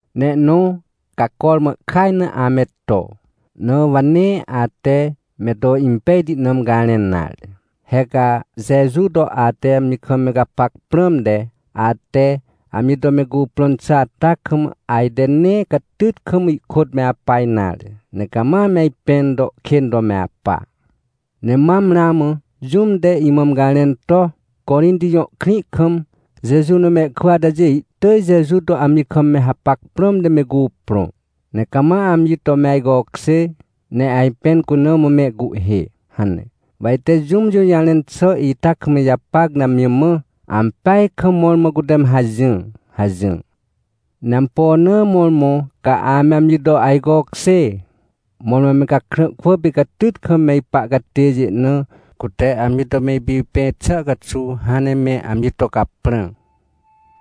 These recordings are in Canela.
Ne ihnõ, ca cormã ihkaj na ame to, na wa nee ate me to impejti na me garẽn nare. He ca Jeju to ate amji kam me gapac prãmte, ate amji to me cuprõn xà ata kam, ajte nee catyt kam ihkôt me apa nare, ne cama me ajpẽn to kên to me apa. Ne mam ramã jũm te imã me garẽn to: — Corinti jõ krĩ kam Jeju na mehkwỳ atajê ihtỳj Jeju to amji kam me hapac prãmte me cuprõ, ne cama amji to me ajcokjê, ne ajpẽn cuna mã mehcuhhê — hane. Wa ite jũm jũjarẽn xà ita kam ijapac ne amji mã: — Ampeaj kam mõrmõ cute me hajỹr — hajỹr. Ne ampo na mõrmõ ca ame amji to ajcokjê? Mõrmõ me gakrã kwỳ pê catyt kam me ipa catêjê na, cute amji to me ipipẽ xà caxuw, hãn ne me amji to caprã.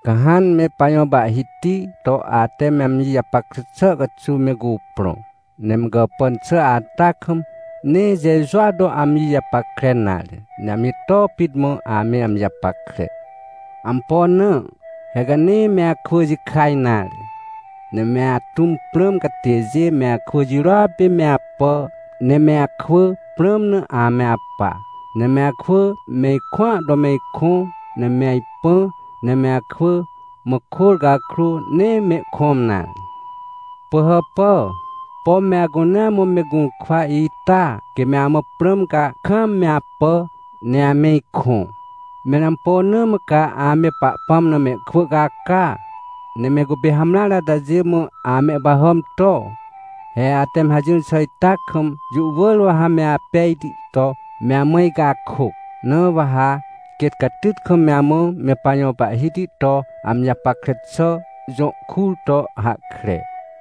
Ca hãn me pajõ Pahhiti to ate me amji japackre xà caxuw me cuprõ, ne me gàpàn xà ata kam, nee Jejua to ame amji japackre nare, ne amji too pit mã ame amji japackre. Ampo na? He ca nee me akwỳ jikaj nare. Ne me atũm prãm catêjê me akwỳ jirôa pê me apà, ne me akwỳ prãm na ame apa. Ne me akwỳ me ikõa to me ikõ, ne me ajpã, ne me akwỳ mã kôr cakrô, nee mehkõm nare. Pỳhàpà! Pom me acunea mã me gũrkwa ita? Quê me amã prãm, ca kaam me apà, ne ame ikõ. Mẽr ampo na mã ca ame Pahpãm na mehkwỳ caca, ne me cupê hamreare atajê mã amehpahàm to? He ate me hajỹr xà ita kam, jũ wỳr wa ha me apejti to me amã icakôc. Na wa ha quêt catyt kam me amã me pajõ Pahhiti to amji japackre xà jõ kur to hahkre.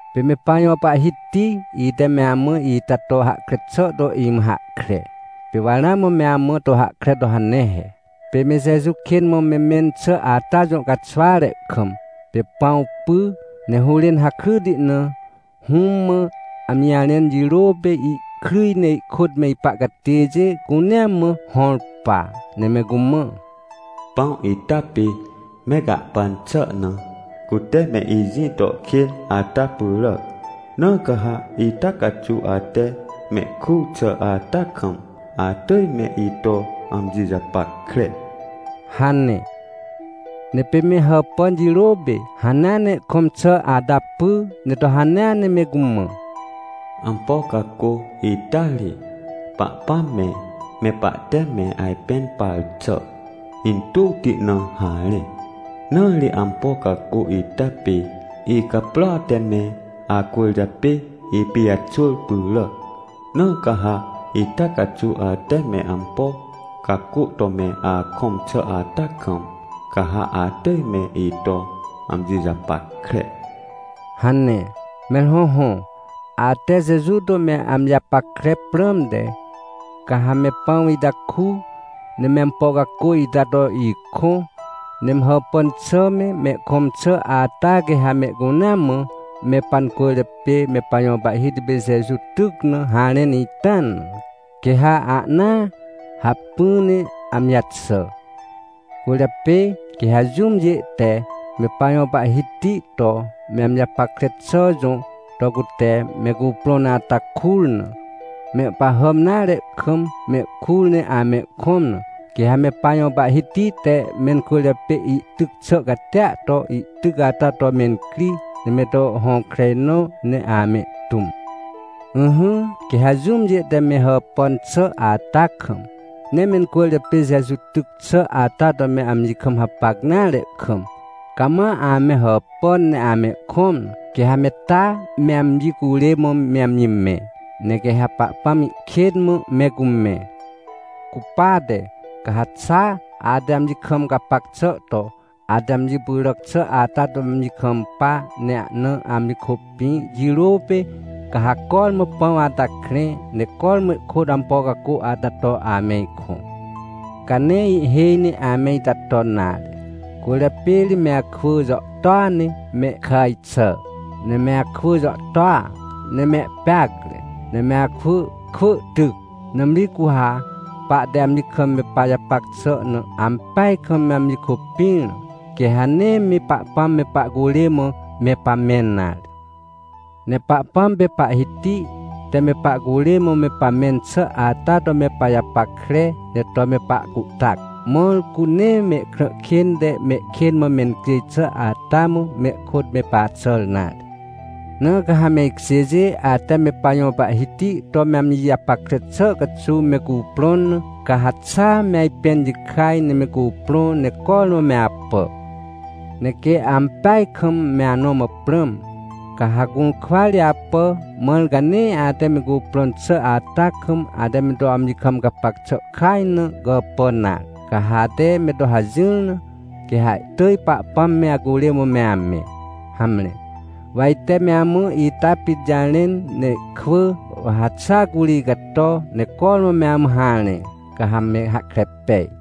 Pê me pajõ Pahhiti, ite me amã ita to hahkre xà to imã hahkre, pê wa ramã me amã to hahkre to hane he. Pê me Jeju kên mã me mẽn xà ata jõ caxware kam, pê pãw py, ne hũrên hakryti na, Hũm mã amji jarẽn jirô pê, ihkryj ne ihkôt me ipa catêjê cunea mã hõr pa. Ne me cumã: — Pãw ita pê me gahpan xà na cute me ijĩ to kên ata pyràac, na ca ha ita caxuw ate mehkur xà ata kam, atỳj me ito amji japackre — hane. Ne pê me hàpàn jirô pê, hanea ne ihkõm xà ata py, ne to hanea ne me cumã: — Ampo cacô ita ri, Pahpãm me, me pahte me ajpẽn par xà intuwti na harẽ. Na ri ampo cacô ita pê icaprôa te me acwỳrjapê ipijaxwỳr pyràc, na ca ha ita caxuw ate me ampo cacô to me akõm xà ata kam, ca ha atỳj me ito amji japackre — hane. Mẽr hõhõ, ate Jeju to me amji japackre prãmte, ca ha me pãw ita ku, ne me ampo cacô ita to ikõ. Ne me hàpàn xà me, mehkõm xà ata quê ha mehcunea mã, me pancwỳrjapê me pajõ Pahhiti pê Jeju tyc na harẽn ita na, quê ha ahnaa hacpỹ ne amji jaxà. Cwỳrjapê quê ha jũmjê te, me pajõ Pahhiti to me amji japackre xà jõ to cute me cuprõn ata kur na, mehpahàm nare kam, mehkur ne amehkõm na, quê ha me pajõ Pahhiti te mencwỳrjapê ihtyc xà catia to, ihtyc ata to mencri, ne me to hõkrenõ, ne amehtũm. Ỹhỹ, quê ha jũmjê te me hàpàn xà ata kam, nee mencwỳrjapê Jeju tyc xà ata to me amji kam hapac nare kam, cama ame hàpàn, ne amehkõm na, quê ha me taa me amji curê mã me amji mẽ, ne quê ha Pahpãm ihkên mã me cumẽ. Cupate, ca ha xa ate amji kam gapac xà to, ate amji pyràc xà ata to amji kampa, ne ahna amji kôpĩ, jirô pê, ca ha cormã pãw ata krẽ, ne cormã ihkôt ampo cacô ata to ame ikõ. Ca nee ihhêj ne ame ita ton nare cwỳrjapê ri me akwỳ jàhtôa ne me kàj xà, ne me akwỳ jàhtôa ne mehpeacre, ne me akwỳ kwỳ tyc. Nãmri cu ha pahte amji kam me pajapac xà na ampeaj kam me amji kôpĩr na, quê ha nee me Pahpãm me pahcurê mã me pamẽn nare. Ne Pahpãm pê Pahhiti te me pahcurê mã me pamẽn xà ata to me pajapackre, ne to me pahcuhtac, mãr cu nee mehkrã kên te mehkên mã mencjêj xà ata mã, mehkôt me paxàr nare. Na ca ha me ikjêjê, ate me pajõ Pahhiti to me amji japackre xà caxuw me cuprõn na, ca ha xaa me ajpẽn jikaj, ne me cuprõ, ne cormã me apà. Ne quê ampeaj kam me anõ mã prãm, ca ha gũrkwa ri apà, mãr ca nee ate me cuprõn xà ata kam, ate me to amji kam gapac xà kaj na, gàpàn nare. Ca ha ate me to hajỹr na, quê ha ihtỳj Pahpãm me acurê mã me amẽ. Hamre, wa ite me amã ita pit jarẽn, ne ihkwỳ, wa ha xa curi icato, ne cormã me amã harẽ, ca ha me hahkre pej.